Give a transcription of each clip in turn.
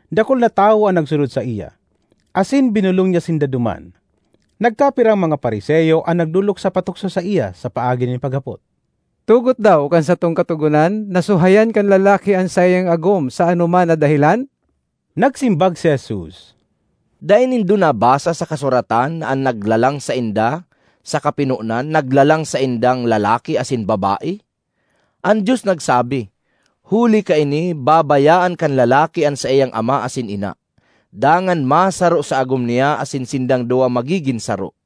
Dakul na tawo an nagsunod saiya, asin binolong niya sinda duman. Nagkapirang mga Fariseo an nagdolok sa patukso saiya sa paagi nin paghapot, “Tugot daw kan satong Katogonan na suhayan kan lalaki an saiyang agom sa anoman na dahelan?” Nagsimbag si Jesus, “Dai nindo nabasa sa kasuratan na an naglalang sainda sa kapinonan, naglalang saindang lalaki asin babae? An Dios nagsabi, ‘Huli kaini, babayaan kan lalaki an saiyang ama asin ina, dangan masaro sa agom niya asin sindang duwa magigin saro.’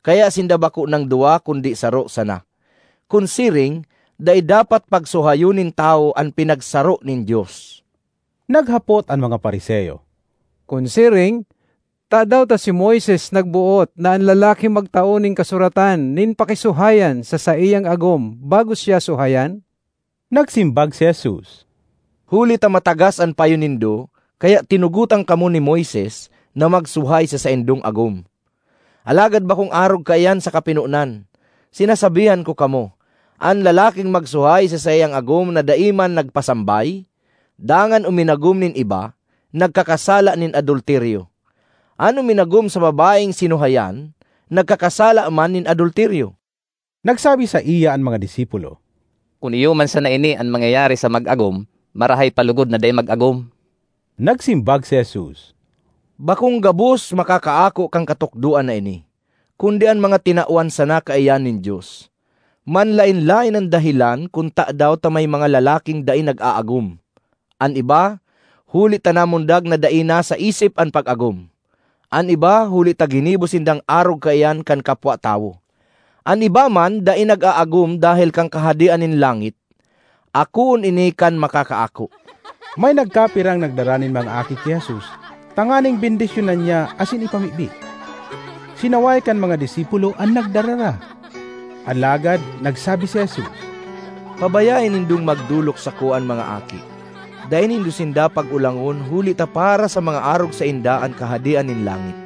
Kaya sinda bako nang duwa kundi saro sana. Kun siring, dai dapat pagsuhayon nin tawo an pinagsaro nin Dios.” Naghapot an mga Fariseo, “Kun siring, tadaw ta si Moises nagboot na an lalaki magtao nin kasuratan nin pakisuhayan sa saiyang agom bago siya suhayan?” Nagsimbag si Jesus, “Huli ta matagas an payo nindo kaya tinugotan kamo ni Moises na magsuhay sa saindong agom. Alagad bakong arog kaiyan sa kapinonan. Sinasabihan ko kamo, an lalaking magsuhay sa saiyang agom na dai man nagpasambay, dangan uminagom nin iba, nagkakasala nin adulteryo. An uminagom sa babaeng sinuhayan, nagkakasala man nin adulteryo.” Nagsabi saiya an mga disipulo, “Kun iyo man sana ini an mangyayari sa mag-agom, marahay pa logod na dai mag-agom.” Nagsimbag si Jesus, “Bakong gabos makakaako kan katukdoan na ini, kundi an mga tinawan sana kaiyan nin Dios. Manlaen-laen an dahelan kun tadaw ta may mga lalaking dai nag-aagom: an iba, huli ta namundag na dai nasa isip an pag-agom; an iba huli ta ginibo sindang arog kaiyan kan kapwa tawo; an iba man dai nag-aagom dahel kan Kahadean nin langit. Akoon ini kan makakaako.” May nagkapirang nagdara nin mga aki ki Jesus tanganing bendisyonan niya asin ipamibi. Sinaway kan mga disipulo an nagdarara. Alagad nagsabi si Jesus, “Pabayae nindong magdolok sako an mga aki. Dai nindo sinda pag-olangon huli ta para sa mga arog sainda an Kahadean nin langit.”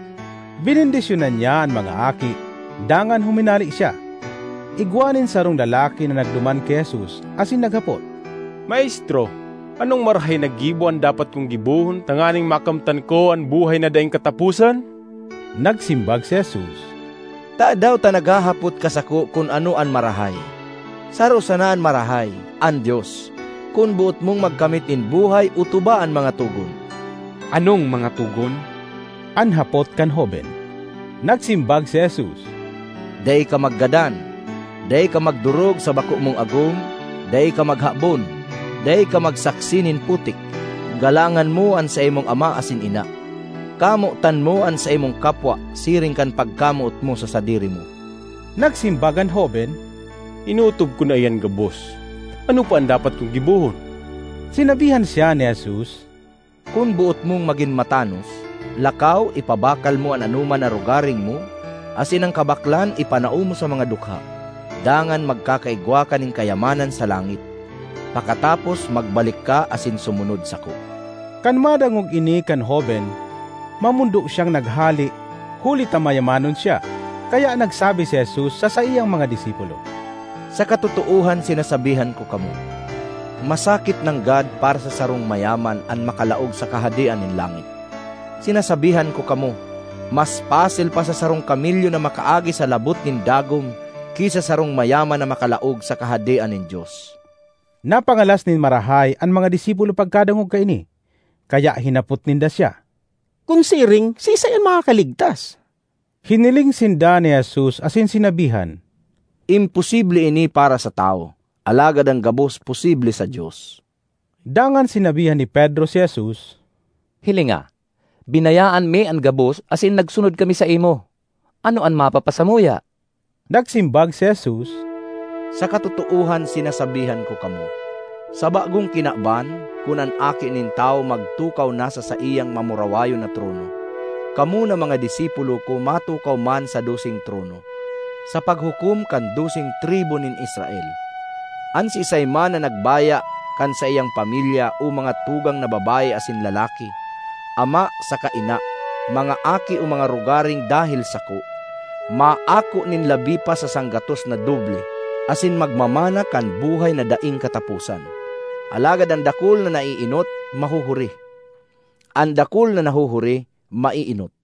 Benendisyonan niya an mga aki dangan huminale siya. Igwa nin sarong lalaki na nagduman ki Jesus asin naghapot, “Maestro, anong marahay na gibo an dapat kong gibohon tanganing makamtan ko an buhay na daing kataposan?” Nagsimbag si Jesus, “Tadaw ta naghahapot ka sako kun ano an marahay? Saro sana an marahay—an Dios. Kun boot mong magkamit nin buhay otoba an mga togon.” ”Anong mga togon?” an hapot kan hoben. Nagsimbag si Jesus, “Dai ka maggadan; dai ka magdorog sa bako mong agom; dai ka maghabon; dai ka magsaksi nin putik; galangan mo an saimong ama asin ina; kamotan mo an saimong kapwa siring kan pagkamoot mo sa sadiri mo.” Nagsimbag an hoben, “Inootob ko na iyan gabos. Ano pa an dapat kong gibohon?” Sinabihan siya ni Jesus, “Kun boot mong magin matanos, lakaw, ipabakal mo an anoman na rogaring mo, asin an kabaklan ipanao mo sa mga dukha, dangan magkakaigwa ka nin kayamanan sa langit; pakatapos, magbalik ka asin sumunod sako.” Kan madangog ini kan hoben, mamondo siyang naghale huli ta mayamanon siya. Kaya nagsabi si Jesus sa saiyang mga disipulo, “Sa katotoohan sinasabihan ko kamo, masakit nanggad para sa sarong mayaman an makalaog sa Kahadean nin langit. Sinasabihan ko kamo, mas pasil pa sa sarong kamelyo na makaagi sa labot nin dagom ki sa sarong mayaman na makalaog sa Kahadean nin Dios.” Napangalas nin marahay an mga disipulo pagkadangog kaini. Kaya hinapot ninda siya, “Kun siring siisay an makakaligtas?” Hiniling sinda ni Jesus asin sinabihan, “Imposible ini para sa tawo, alagad an gabos posible sa Dios.” Dangan sinabihan ni Pedro si Jesus, “Hilinga, binayaan mi an gabos asin nagsunod kami saimo. Ano an mapapasamuya?” Nagsimbag si Jesus, “Sa katotoohan sinasabihan ko kamo, sa Bagong Kinaban, kun an Aki nin Tawo magtukaw na sa saiyang mamurawayon na trono, kamo na mga disipulo ko matukaw man sa doseng trono, sa paghukom kan doseng tribu nin Israel. An siisay man na nagbaya kan saiyang pamilya o mga tugang na babae asin lalaki, ama saka ina, mga aki o mga rogaring dahel sako, maako nin labi pa sa sanggatos na doble, asin magmamana kan buhay na daing kataposan. Alagad an dakul na naeenot mahuhuri; an dakul na nahuhuri maeenot.